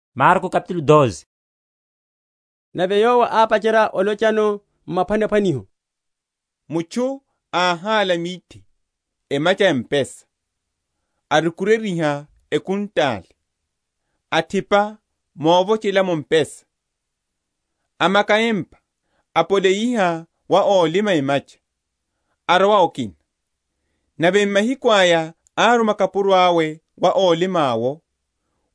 Niphwanaphwaniho na ókhapelela emacha. Nave Yowo ápacherya olochano m’maphwanaphwaniho. Mutchu áhála mithe emacha ya mpesa, arukuryeryiha ekhuntale, athipa movochelamo mpesa, amaka empa, apoleyiha wa ólima emacha, arowa okina. Nave m’mahiku aya áruma kapuro awe wa ólima’wo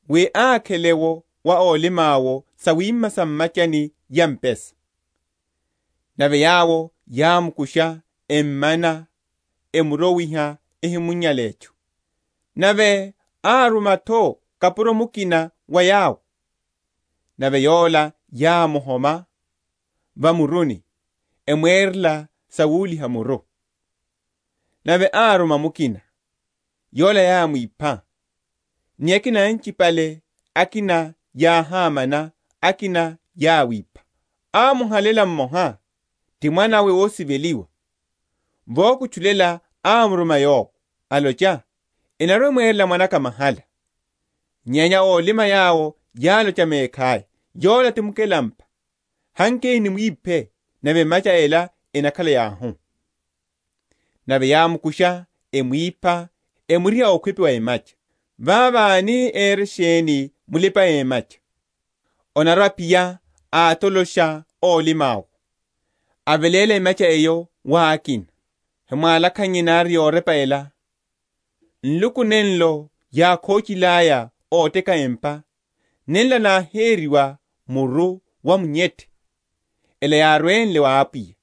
wi ákhele’wo wa ólima’wo sawima sa mwimachani ya mpesa. Nave yawo yámukusha, emmana, emuro?-?wiha ehimunyile etchu. Nave áruma’tho kapuro mukina wa yawo; nave yola yámuhoma va muruni, emwerela sowuliha‐muru. Nave áruma mukina; yola yámwipha; ni akina anchipale; akina yáhámana, akina yáwipha. Amuhalela mmoha, ti mwana’we ósiveliwa; vokutchulela ámuruma yowo, alocha, Enarwa‐emwerela mwana’ka mahala. Nyenya ólima yawo yálocha mekhaya, Yola ti mukelampa; hankeni nimwiphe, nave emacha ela enakhala yauhu. Nave yámukusha emwipha, emuriha okhwipi wa emacha. Vavo ani ere sheni mulipa‐emacha? Anarwa‐aphiya, atolosha ólima’wo, aveléla emacha eyo wa akina. Hemwálakhannye nari yorepa ela; Nluku nenlo yákhochilaya óteka empa, Nenla náheriwa muru wa munyethe: Ela yárwenle wa Apwiya,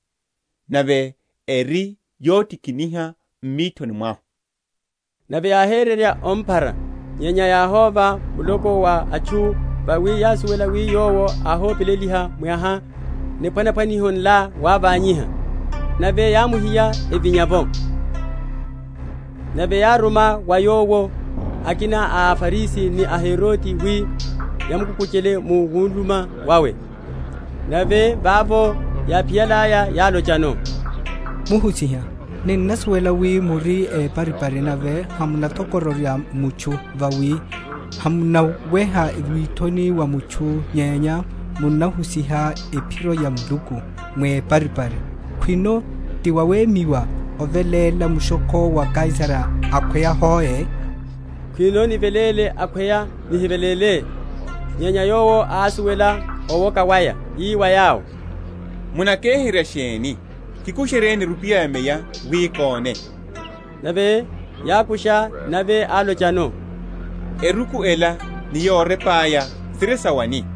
Nave eri yotikiniha m’mithoni mwahu? Nave yáhérerya omphara; nyenya yáhóva muloko wa atchu vawi yásuwela wi Yowo áhopeleliha mwaha niphwanaphwaniho nla wávanyiha; nave yámuhiya, evinya’vo. Ehuseryo ya mushokho. Nave yáruma wa Yowo akina a aFarisi ni aHerode, wi yamukukuchele mu wuluma wawe. Nave vavo yáphiyalaya, yálochano, Muhusiha, Ninnasuwela wi muri éparipari, nave hamunathokororya mutchu; vawi hamunaweha withoni wa atchu, nyenya munahusiha ephiro ya Muluku mweparipari; Khwino ti wawemyiwa oveléla mushokho wa Kaisara akhweya hoe? Khwino niveléle, akhweya nihiveléle? Nyenya Yowo ásuwela owoka waya, ii wa yawo, Munakeherya sheni? Kikusheryeni erupiya ya meya wi kóne. Nave yákusha, Nave álochano, Eruku ela ni yorepa aya siri sa wani?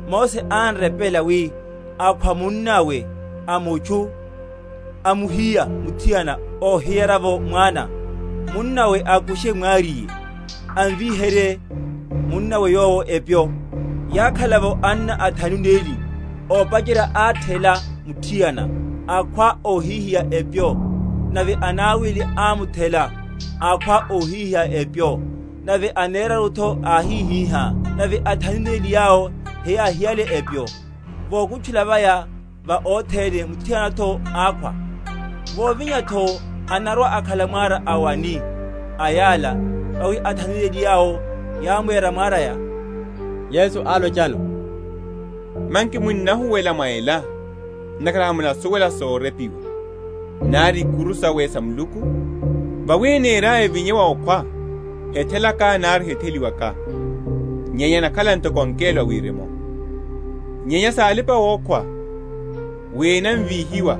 Mose án’repela wi, Akhwa munnawe a mutchu amuhiya muthiana, óhihiya’vo mwana, munnawe akushe mwariye, amvíherye munnawe yowo epyo. Yákhala’vo anna athanu neli; ópacherya áthela muthiana, akhwa, óhihiya epyo; nave anawili ámuthela, akhwa, óhihiya epyo; nave aneraru’tho áhihihá; nave athanu neli yawo heyáhiyale epyo. Vokutchulela vaya va othene muthiana’tho ákhwa. Vovinya’tho anarwa‐akhala mwara a wani a yala? Vawi athanu neli yawo yámwera mwaraya. Yesu álochano, Manki munnahuwela mwa ela, ntakhara hamunasuwela sorepiwa, nari ikuru sawe sa Muluku? Vawi eniryaya evinye wa okhwa, hethelaka nari hetheliwaka; nyenya enakhala ntoko angelo a wirimu. Nyenya sa alipa‐okhwa wi enavíhiwa;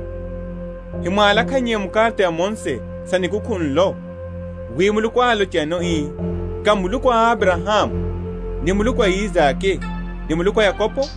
hemwálakhannye mu’karata ya Mose sa nikukhu nlo, wi Muluku álochano ii, Ká Muluku a Abrahamu, ni Muluku a Isake, ni Muluku a Yakobo?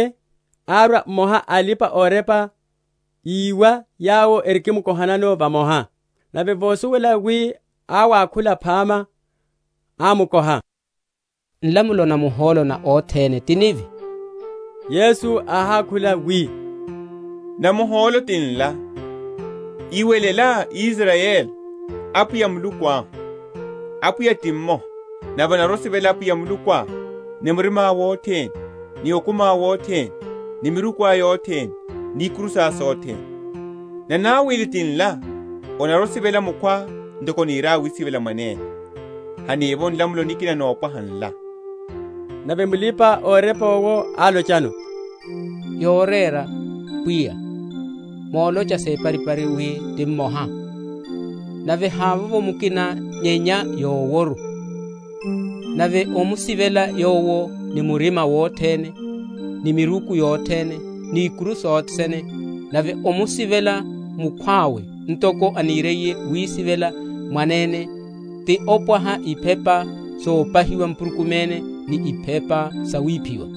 Nave árwa mmoha a alipa‐orepa, íwa yawo erikimkohanano vamoha, nave vosuwela wi áwakhula phama, ámukoha, Nlamulo namuhólo na othene ti nivi? Yesu áhákhula, wi, Namuhólo ti nla, Iwelela, Israyeli; Apwiya Muluku ahu, Apwiya ti mmoha; nave onarwa‐osivela Apwiya Mulukuá, ni murimá wothene, ni okumiá wothene, ni mirukuá yothene, ni ikuru sá sothene. Nanawili ti nla, Onarwa‐osivela mukhwá ntoko onirá wisivela mwanene. Hanivovo nlamulo nikina nopwaha ala. Nave mulipa‐orepa owo álochano, Yorera, Pwiya, molocha separipari wi ti mmoha; nave havovo mukina nyenya Yoworu: nave omusivela Yowo ni murima wothene, ni miruku yothene, ni ikuru sothene, nave omusivela mukhwawe ntoko aniriye wisivela mwanene, ti opwaha iphepa sopahiwa mpurukumene ni iphepa sawiphiwa.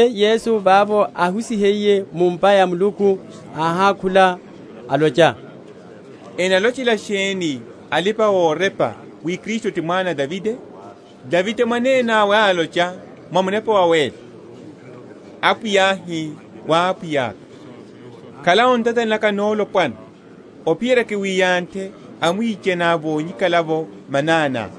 Nave Yesu vavo áhusihiye mu’mpa ya Muluku áhákhula, alocha, Enalochela sheni alipa‐orepa wi Kristu ti mwana a Davide? Davide mwananawe álocha mwa Munepa Wawéla, Apwiya áhi wa Apwiyaka, Khala o ntatani naka nolopwana, ophiyerya kiwiyanthe amwichaniá vonyikala’vo mananiá.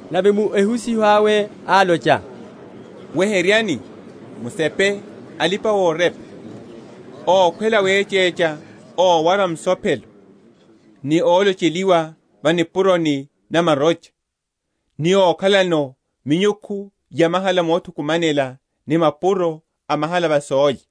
Nave mu ehusiho awe álocha, Weheryani, musepe alipa‐orepa, ókhwela wechecha ówara misopero, ni olocheliwa va nipuroni na marocha, ni okhalano minyukhu yamahala mothukumanela ni mapuro a mahala va sólya;